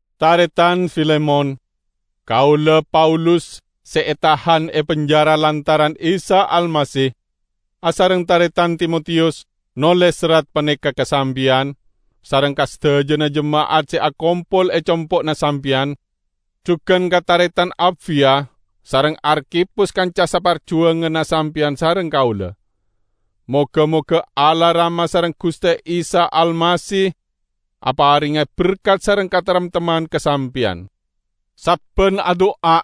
Taretan Filemon! Kaula, Paulus, se etahan e penjara lantaran Isa Almasih, asareng taretan Timotiyus, noles serrat paneka ka sampeyan sareng ka sadajana jema'at se akompol e compo'na sampeyan; jugan ka taretan Apfiya, sareng Arkhipus kanca saparjuwanganna sampeyan sareng kaula. Moga-moga Allah Rama sareng Guste Isa Almasih aparenga berkat sareng kataremtemman ka sampeyan. Sabban adu'a,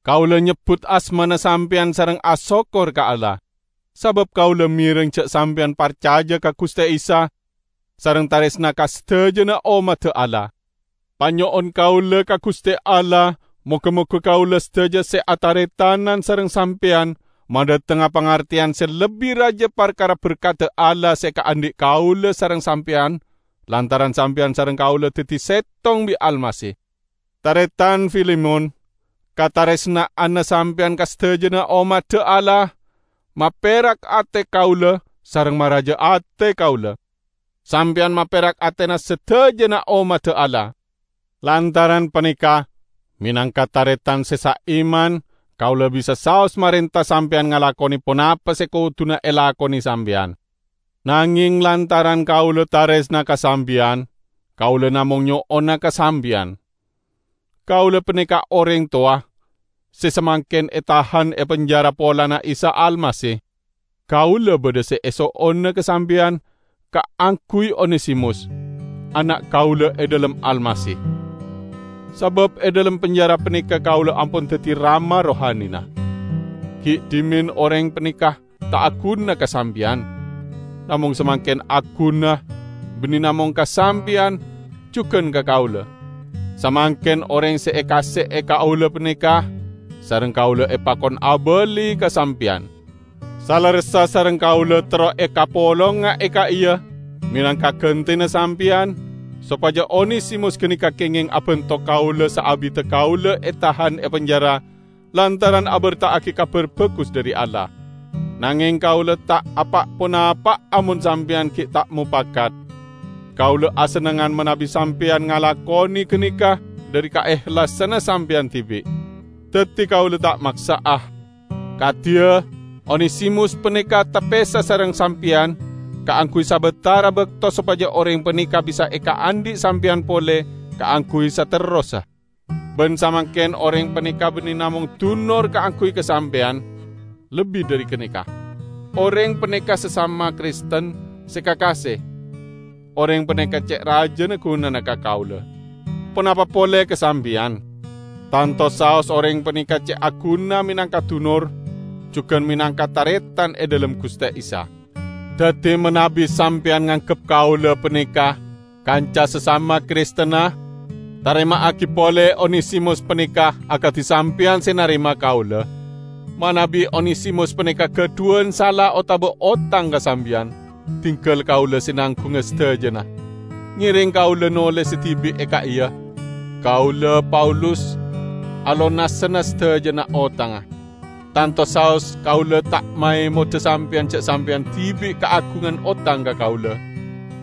kaula nyebbut asmana sampeyan sareng asokkor ka Allah. Sabab kaula mereng ja' sampeyan parcaja ka Guste Isa sareng taresna ka sadajana ommadda Allah. Panyo'on kaula ka Guste Allah moga-moga kaula sadaja se ataretanan sareng sampeyan madhatengnga pangarteyan se lebbi raja parkara berkadda Allah se ekaandhi' kaula sareng sampeyan lantaran sampeyan sareng kaula daddi settong bi' Almasih. Taretan Filemon, kataresna'anna sampeyan ka sadajana ommadda Allah, maperak ate kaula sareng maraja ate kaula! Sampeyan maperak atena sadajana ommadda Allah. Lantaran paneka, menangka taretan se saiman, kaula bisa saos marenta sampeyan ngalakone ponapa se koduna elakone sampeyan. Nangeng lantaran kaula taresna ka sampeyan, kaula namong nyo'ona ka sampeyan. Kaula paneka oreng towa, se samangken etahan e penjara polana Isa Almasih. Kaula badha se eso'ona ka sampeyan kaangguy Onesimus, ana' kaula e dhalem Almasih. Sabab e dhalem penjara paneka kaula ampon daddi rama rohanina. Gi' dhimen oreng paneka ta' aguna ka sampeyan, namong samangken aguna, banne namong ka sampeyan, jugan ka kaula. Samangken oreng se ekaase'e kaula paneka, sareng kaula epakon abali ka sampeyan. Salerressa sareng kaula terro ekapolonga e ka'iya menangka gantena sampeyan, sopaja Onesimus ganeka kengeng abanto kaula saabidda kaula etahan e penjara lantaran aberta'agi Kabar Bagus dhari Allah. Nangeng kaula ta' apa'-ponapa'a mon sampeyan gi' ta' mopakat. Kaula asennengngan manabi sampeyan ngalakone ganeka dhari kaehlasanna sampeyan dibi'. Daddi kaula ta' maksa'a. Kadiya, Onesimus paneka tapesa sareng sampeyan kaangguy sabatara bakto sopaja oreng paneka bisa ekaandhi' sampeyan pole kaangguy saterrossa. Ban samangken oreng paneka banne namong dunor kaangguy ka sampeyan; lebbi dhari ganeka. Oreng paneka sasama Kristen se kakase. Oreng paneka ce' rajana gunana ka kaula, ponapa pole ka sampeyan! Tanto saos oreng paneka ce' aguna menangka dunor, jugan menangka taretan e dhalem Guste Isa! Daddi, manabi sampeyan nganggep kaula paneka kanca sasama Kristenna, tarema'agi pole Onesimus paneka akadi sampeyan se narema kaula. Manabi Onesimus paneka gadhuwan sala otaba otang ka sampeyan, dinggal kaula se nanggunga sadajana. Ngereng kaula nolesa dibi' e ka'iya: Kaula, Paulus, alonasana sadajana otangnga. (Tanto saos kaula ta' maemoda sampeyan ja' sampeyan dibi' kaagungan otang ka kaula,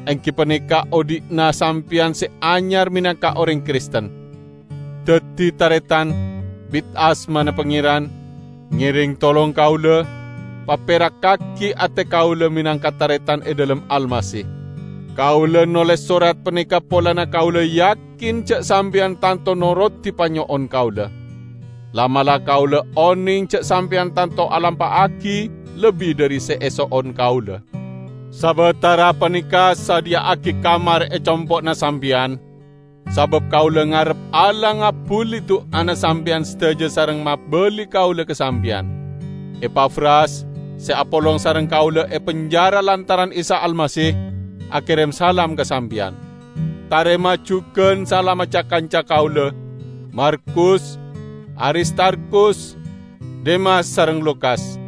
enggi paneka odhi'na sampeyan se anyar menangka oreng Kristen.) Daddi, taretan, bit asmana Pangeran, ngereng tolong kaula, paperakkagi ate kaula menangka taretan e dhalem Almasih. Kaula noles sorat paneka polana kaula yakin ja' sampeyan tanto norodi panyo'on kaula. La'-mala' kaula oneng ja' sampeyan tanto alampa'agi lebbi dhari se eso'on kaula. Sabatara paneka, sadhiya'agi kamar e compo'na sampeyan, sabab kaula ngarep Allah ngabbuli du'ana sampeyan sadaja sareng mabali kaula ka sampeyan. Epafras, se apolong sareng kaula e penjara lantaran Isa Almasih, akerem salam ka sampeyan. Tarema jugan salamma ca-kanca kaula: Markus, Aristarkhus, Demas sareng Lukas.